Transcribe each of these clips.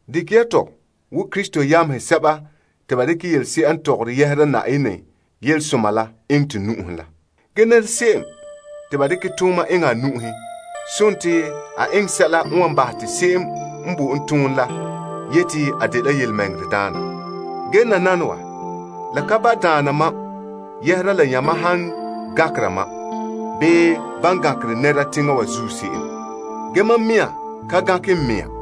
Dekɛ ya tɔ wo Krista yamehe sɛba te ba dekɛ yelese'a n tɔgɔre yɛhera Na'ayenɛ Yelesoma la eŋɛ to nu'uhen la. Ge se'em te ba dekɛ tooma eŋɛ a nu'uhen, la dela a eŋɛ sɛla n wan bahɛ te se'em n bo en tooma la yete a de yelemɛŋɛrɛdaana. Ge nananawa, la ka ba' daana mam yɛhera la yamam han gankere mam, bii ban gankere nɛra teŋa wa zuo se'em. Ge mam mea ka gankɛ n mea.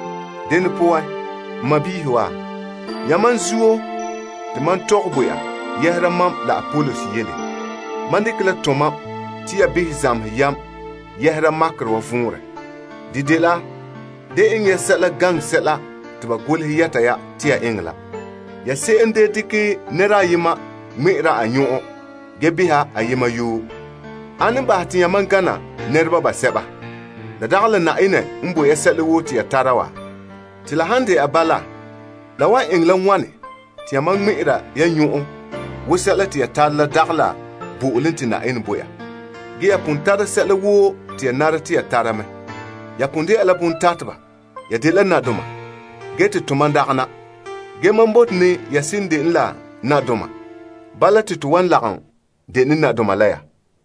Dene poan wa, n sɔɔnrɔ yamam zuo te mam tɔgɛ bo ya yɛhera mam la Apolos yele. Mam dekɛ la tomam te ya behɛ zamehɛ yam yɛhera makerɛ wa vɔnrɛ. De dela, Da eŋɛ ya sɛla gaŋɛ sɛla te ba golehɛ yɛta ya te ya eŋɛ la. Ya se'em da dekɛ nɛra ayema ŋmɛ'ɛra a nyɔn'ɔn, ge beha ayema yoo. Ane n bahɛ ya te yamam gana nɛreba basɛba? La dagɛ la Na'ayenɛ n bo ya sɛla woo te ya tara wa? Te la han dɛna bala la wan eŋɛ la wane te ya ŋmɛ'ɛra ya nyɔn'ɔn wo sɛla te ya tara la dagɛ la bo'olom te Na'ayenɛ bo ya? Ya pon tara sɛla woo te ya bɔta mɛ? Yamam pon dɛna la bontateba? Yamam pon dɛna la nadoma, ge tomam dagana wa? Mam bote ne te ya seren dene nadoma, te to lagom dene nadoma la ya.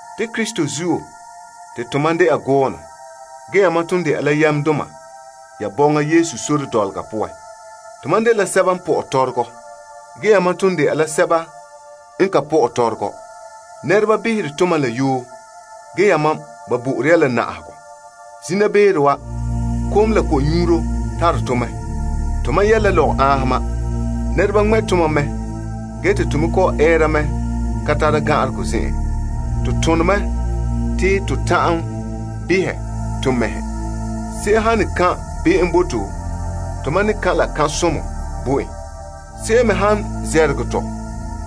Te Krista zuo, te to mam dɛna gɔɔnɔ. Ge yamam ton dɛna la yamdoma ya bɔŋa Yesu sore dɔlɔga poan. To mam dela sɛba n pɔ'ɛ tɔrɔgɔ, ge yamam ton dɛna la sɛba n ka pɔ'ɛ tɔrɔgɔ. Nɛreba behere tomam la yoo, ge yamam ba bo'ore ya na'ahegɔ mɛ. Zina beere wa, kom la ko'nyuuro tare tɔ mɛ. Tomam yɛ' la lɔgɔ'anhoma. Nɛreba ŋmɛ' tomam mɛ, ge te to me kɔ'ɔn ɛɛra mɛ ka tara gan'aregɔ zen'an. To tone mɛ, te to ta'an behɛ to mɛhe. Se'em han ne kan' kan' be'em bo to, tomam ne kan' la kan'somɔ bo en. Se'em me han ne namehegɔ tɔ,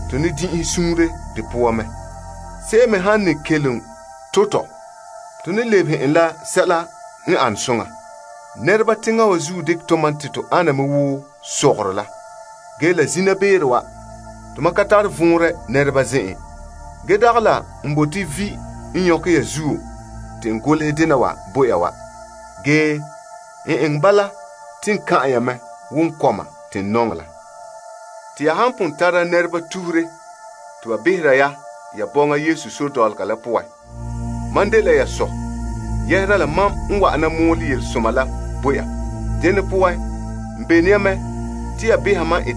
to ne din'inhe suunre de poan. Se'em me han ne to' tɔ, to ne lebehe en la sɛla n ane soŋa. Nɛreba teŋa wa zuo dekɛ tomam te to ana wo sɔgɔrɔ la. Ge la zina beere wa, tomam ka tare vɔnrɛ nɛreba zen'en. Ge dagɛ la n bote vi' n nyɔkɛ ya zuo te n golehɛ dena wa bo ya wa. Ge n eŋɛ bala te n kan'an ya mɛ wo n kɔma te n nɔŋɛ la. Te ya han pon tara nɛreba tuhure te ba behera ya ya bɔŋa Yesu sore dɔlɔga la poan, mam ma'an n de ya sɔ. Se'ere n sɔe la, mam n wa'ana mɔɔlɛ yelesoma la bo ya. Dene poan, n bene ya mɛ te ya tɔgɔha mam.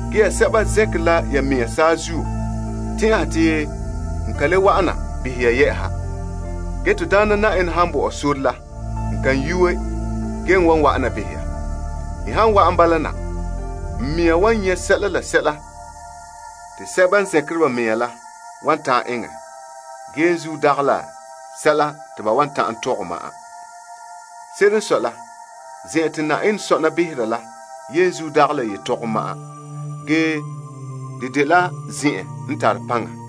Ge ya sɛba zɛnkere la ya mea saazuo tɛn'ɛha te n ka le wa'ana behɛ ya. Ge to Daana Na'ayenɛ han bo mam sore la n kan yuue, ge n wan wa'ana behɛ ya. N han wa'an bala na, n mea wan nyɛ sɛla la sɛla, te sɛba n zɛnkere ba mea bala, la wan ta'an eŋɛ, ge la dagɛ la sɛla te ba wan ta'an tɔgɛ ma'an. Se'ere n sɔe la, Na'ayenɛ sɔ'ɔlom la poan dagɛ la yetɔgom ma'an, ge paŋa.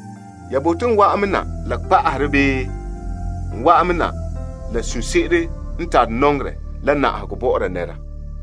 Ya bote la dene? N wa'an na la kpa'aherɛ bii n wa'an na la suunre se'ere n tare nɔŋerɛ la na'ahegɔ bɔ'ɔra nɛra?